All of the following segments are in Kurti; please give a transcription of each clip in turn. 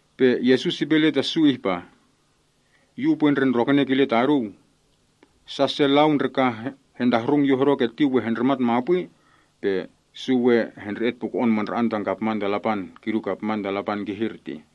Pe Yesus ipe ile ta su ihpa, “Yu upwe ndre ndrokene kile ta oduu. Sa se lau ndre ka hentahrung Yu hodo keti we hendrimat mapwi, pe su we hendre‑et puko‑on mandra‑an tan kapman ta Lapan, kidu kapman ta Lapan kihir tih.”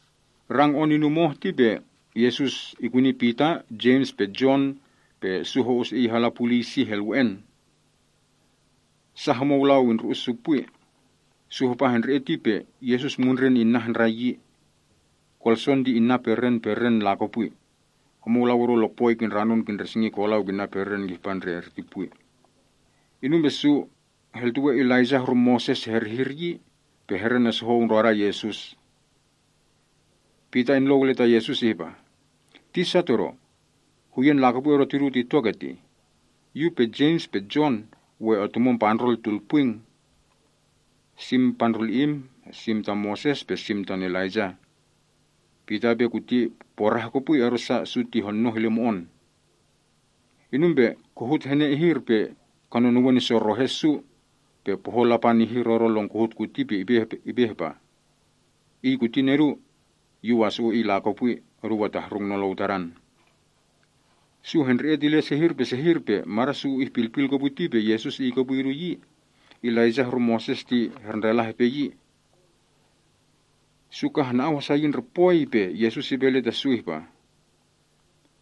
Rang on inum oh ti pe Yesus ikuni Pita, Jems pe Jon, pe su ho‑us Iy hala puliy sih elwe‑en. Sa homou lau indru‑us su pwi. Su hapa hendre‑et ti pe Yesus mundren inna handrai yi. Kolson ti inna peren peren lakopwi. Homou lau odo lokpoi kindranon kindresingi kolau kinna peren kihpa ndre erti pwi. Inum pe su heltuwe Elaijah horu Moses herihir yi, pe herenesohou ndroda Yesus. Pita inlou ile ta Yesus ihpa, “Tisa todo. Huyen lakopwi odo tidu tito ketih. Yu pe Jems pe Jon we otumon pandrol tulpwing. Sim Tadam, sim tam Moses pe sim tan Elaijah.” Pita ipe kuti porah kopwi, odosa su ti honoh ile mo‑on. Inum pe kohut hene ihir pe kanunuwen isorohe su. Pe pohon Lapan ihir odo lon kohut kuti pe ipe ihpa, “Iy kuti Nedu. Yu wasu‑u Iy lakopwi. Oduu atahrung nolou Tadan.” Su hendre‑et ile sehir pe sehir, pe mada’ su ihpilpil kopwi ti pe Yesus Iy kopwi idu. Elaijah horu Moses ti herndrela hepe yi. Su ka hana‑au hasa yi ndre pwoi, pe Yesus ipe ile ta su ihpa,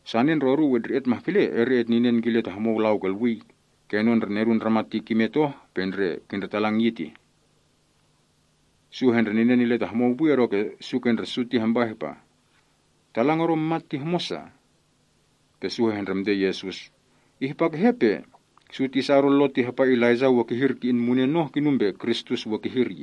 “Sane ndre oduu etndre‑et mahkele, eri etninen kile ta homou lau kolwii, kenon ndre Nedun Ndramat ti kimet oh pe ndre kindretalang yi.” Su hendrininen ile ta homou pwi, odoke su ke ndre su ti hampa ihpa, “Talang odo mat ti homosa?” Pe su hehndremte Yesus, “Ihpa kehe pe su tisa odo Lo ti hapa Elaijah ti we kihir ki‑in munen oh, kinum pe Kristus we kihir?”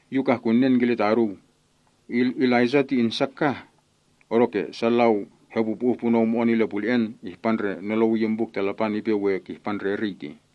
Yu kah kunen kile ta oduu. Elaijah ti insa kah. Odoke sa lau hepupu‑uh punou mo‑on ile pule‑en, ihpa ndre nolou iyin Buk ta Lapan ipe we kihpa ndre eriy tih.”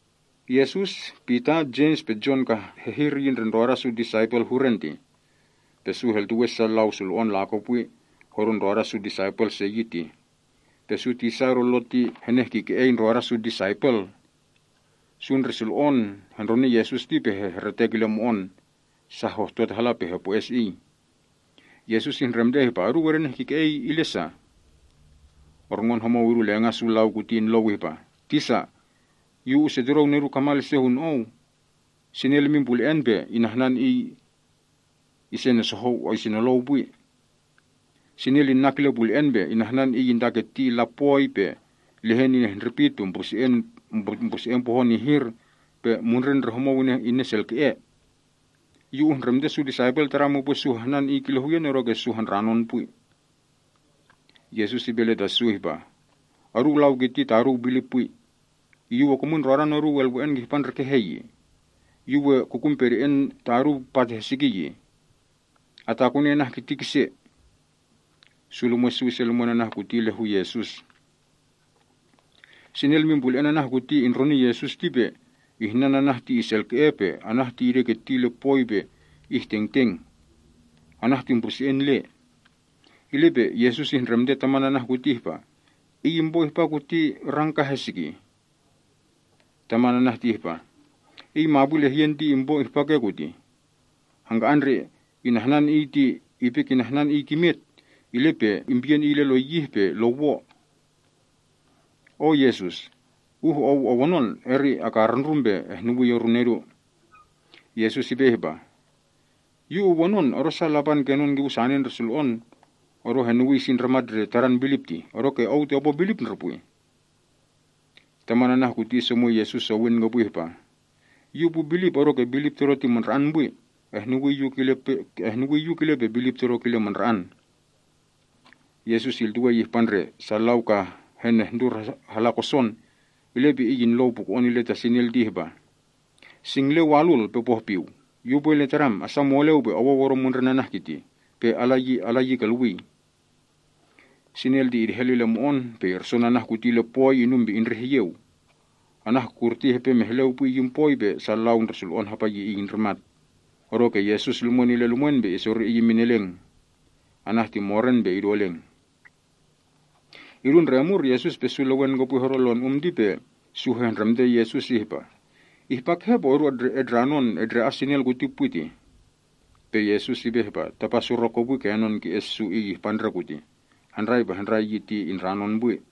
Yesus, Pita, Jems pe Jon kah hehir yi ndre ndroda su disaipel huren tih. Pe su heltuwe sa lau sulo‑on lakopwi hodo ndroda su disaipel se yi tih. Pe su tisa odo Lo ti henehkike‑ei ndroda su disaipel. Sa ndre sulo‑on hendroni Yesus ti pe hehretek ile mo‑on. Sa hohtot hala pe hopwo-es Iy. Yesus ihndremte ihpa, “Oduu edenehkike‑ei ile sa?” Orngon homou idu lenga’ su lau ti inlou ihpa, “Tisa, yu usetudou nedu kamal ise hun Ou. Sinel imin pule‑en pe inahnan iy isenolou pwi. Sinel ti inak ile pule‑en pe inahnan iy intaketi illa pwoi, pe lehen inehndrepit, pe mbruse‑en pohon ihir, pe mundren ndre homou ineselke‑e. Yu uhndremte su disaipel Tadam upwe su hahnan iy kile huyen, odoke su handranon pwi.” Yesus ipe ile ta su ihpah, “Oduu lau kiti taduu bilip pwi. Yu we kumwin ndrodan oduu elwe‑en kihpa ndre kehe yi? Yu we kukun pede‑en ta oduu pat hesiki yi? Atakuni anah ti kise!” Su lumwe’ su ise lumwen anah kuti ile hu Yesus. Sinel imin pule‑en anah kuti indroni Yesus ti pe ihnan anah ti iselke‑e, pe anah ti ideketi ile poi pe ingkilkil. Anah ti mbruse‑en le. Ile pe Yesus ihndremte taman anah kuti ihpa, “Iy impo ihpa kuti kah rang heski?” Taman anah ti ihpa, “Iy mapwi lehyen ti impo ihpa ke kutih. Hangka‑an ndre inahnan iy ti ipe kinahnan iy kimet, ile pe impiyen iy ile lo yih pe lo wo. O Yesus, uh Ou owonon, eri akarundrum pe ehnuwii oru nedu.” Yesus ipe ihpah, “Yu uwonon, odosa Lapan kenon kipu sane ndre sulo‑on odo henuwii si ndramat ndre tadan bilip tih. Odoke ou ti opo bilip ndre pwi?” Taman anah kuti isomwi Yesus sowin kopwi ihpah, “Yu upu bilip, odoke bilip todo ti mandra‑an pwi. Ehnuwii yu, kile pe bilip todo kile mandra‑an.” Yesus iltuwei ihpa ndre sa lau ka henehndur hala koson, ile pe Iy inlou puko‑on ile ta sinel ti ihpa, “Singlen walul pe pohpiw, yu upwe ile tadam, asa moleu pe owou odo mundren anah kirtih, pe ala yi kolwii!” Sinel ti idehel ile mo‑on, pe irson anah kuti ile poi, inum pe indreh iyeu. Anah kurti hepe mehleu pwi iyin poi, pe sa lau ndre sulo‑on hapa yi iy indrimat. Odoke Yesus lumwen ile lumwen pe isori iy imin eleng. Anah ti moren pe idu eleng. Idu ndre omur, Yesus pe su lewen kopwi hodo lon um ti pe su hehndremte Yesus ihpa, “Ihpa kehe pe odu etndranon etndre‑as sinel kuti pwi tih?” Pe Yesus ipe ihpa, “Tapa surok kopwi kenon ki‑es su iy ihpa ndre kurtih. Handrai pe handrai yi ti indranon pwi.”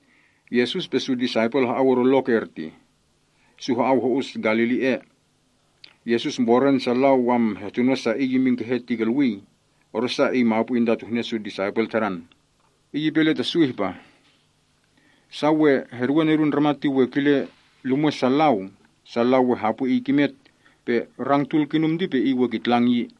Yesus pe su disaipel ha‑au odo lok ertih. Su ha‑au ho‑us Galili ea. Yesus mboren sa lau hehtuno sa Iy imin kehe tih, odosa Iy mapwi intatuhne su disaipel Tadan tih. Iy ipe ile ta su ihpah, “Sa we heduwe Nedun Ndramat ti we kile lumwe’ sa lau. Sa lau we hapwi Iy kimet. Pe rang tul kinum ti pe Iy we kitlang yi.”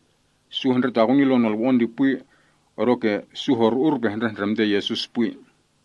Su hendretakuni lon nolwo‑on ti pwi, odoke su horu‑ur pe hendrehndremte Yesus pwi.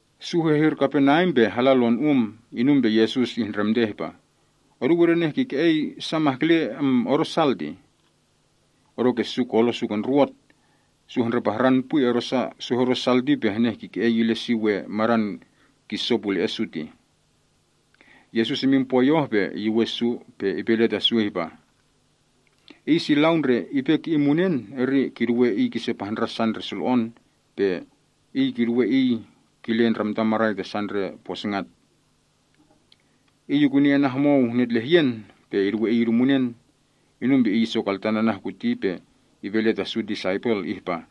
Su hehir Kaperneam pe hala lon um. Inum pe Yesus ihndremte ihpa, “Oduu edenehkike‑ei sa mahkele odo sal tih? Odoke su kolo’ su ke ndruwot. Su hendrepahran pwi odosa, su hodo sal ti pe henehkike‑ei ile si we madan kiso pule‑e’ su tih. Yesus imin pwoi oh pe iyuwen su, pe ipe ile ta su ihpah, “Iy si lau ndre ipe ki‑in munen eri kiduwe iy kise pahndra’ sa ndre sulo‑on, pe kiduwe iy kile ndramtan marai ta sa ndre posingat.” Iy ikuni anah homou netlehyen pe iduwe iy idu munen. Inum pe Iy isokohan anah kuti pe ipe ile ta su disaipel ihpah,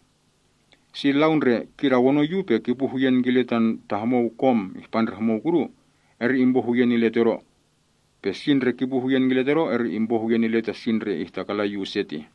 “Si lau ndre kidawonon Yu pe kipu huyen kile ta homou kom ihpa ndre homou kudu, eri impo huyen ile Todo. Pe si ndre kipu huyen kile Todo, eri impo huyen ile tan Iy si ndre ihtakalan Yu use tih.”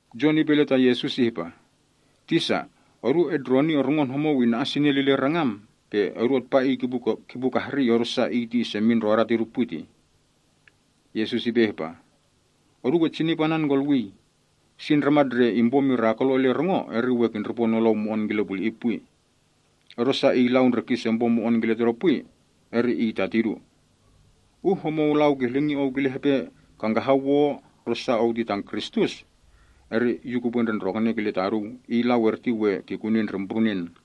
Jon ipe ile ta Yesus ihpa, “Tisa, odu etndroni orngon homou ina‑as sinel ile rangam, pe odu atpa iy kipu kahrii, odosa iy ti isemin ndrodan tidu ti pwi.” Yesus ipe ihpa, “Oduu etsinip anan kolwii. Si ndramat ndre impo mirakulo ile rongo, eri we kindripo nolou mo‑on kile puli‑i pwi. Odosa iy lau ndre kisempo mo‑on kile ta tidu pwi, eri iy ta tidu. Uh homou lau kihlingi ou kile hepe kangkahan wo odosa ou ti tan Kristus, eri Yu kupwe ndre ndrokone kile taduu, iy lau erti we kikuni ndre mbrunen.”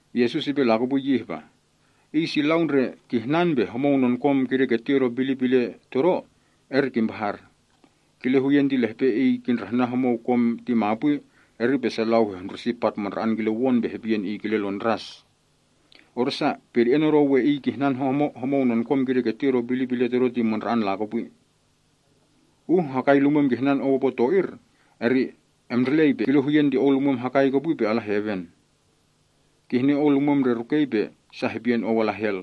Yesus ipe lakopwi yi ihpah, “Iy si lau ndre kihnan pe homou nenkom kideketi odo bilip ile Todo, eri kimpahar. Kile huyen ti lehpe iy kindrahnan homou kom ti mapwi eri sa lau hehndrusi pat mandra‑an kile won pe hepiyen iy kile lon ndras. Odosa, pede‑en odo iy kihnan homou nenkom kideketi odo bilip ile Todo ti mandra‑an lakopwi. Uh hakai lumwem kihnan ou opo to‑ir, eri emndrelei pe epiyen ke‑eu. Kile huyen ti ou lumwem ke hakai pe ala heven. Kihne ou lumwem ndre rukei pe sa hepiyen ou ala hel.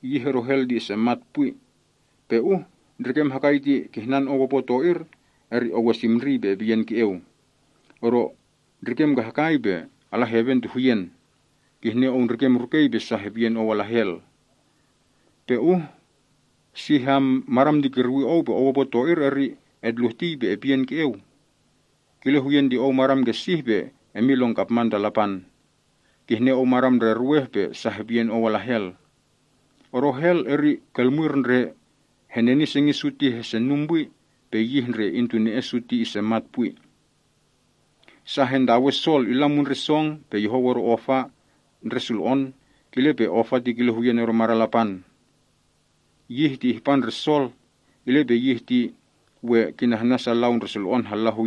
Yih odo hel ti isemat pwi. Pe uh ndrikem hakai ti kihnan ou opo to‑ir, eri ou emndrelei pe epiyen ke‑eu. Ou ndrikem ke hakai pe ala heven ti huyen. Kihne ou ndrikem rukei pe sa hepiyen ou ala hel. Pe uh sih madam ti kirwi ou pe ou opo to‑ir, eri etluhtii pe epiyen ke‑eu. Kile huyen ti ou madam ke sih pe emin lon kapman to Lapan. Kihne ou madam ndre ruweh pe sa hepiyen ou ala hel. Odo hel, eri ul ndre heneni sengi’ su ti hesenum pwi, pe yih ndre intune‑en su ti isemat pwi. “Sa hentawe sol illa mundren song pe yohou odo ofa ndre sulo‑on, kile pe ofa ti kile huyen odo madan Lapan. Yih ti ihpa ke eriy. Yih ti we kihir ta sa lau ndre sulo‑on.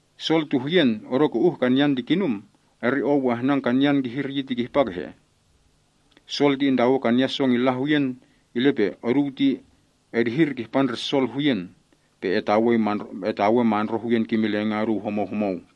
“Sol ti huyen, odoke uh kanyan ti kinum, eri ou we ahnan kanyan kihir yi ti kihpa kehe? Sol ti intawe kanyan song illa huyen, ile pe oduu yi ti edihir kihpa ndre sol huyen, pe etawe penuw kimin lenga’ oduu homou homou.”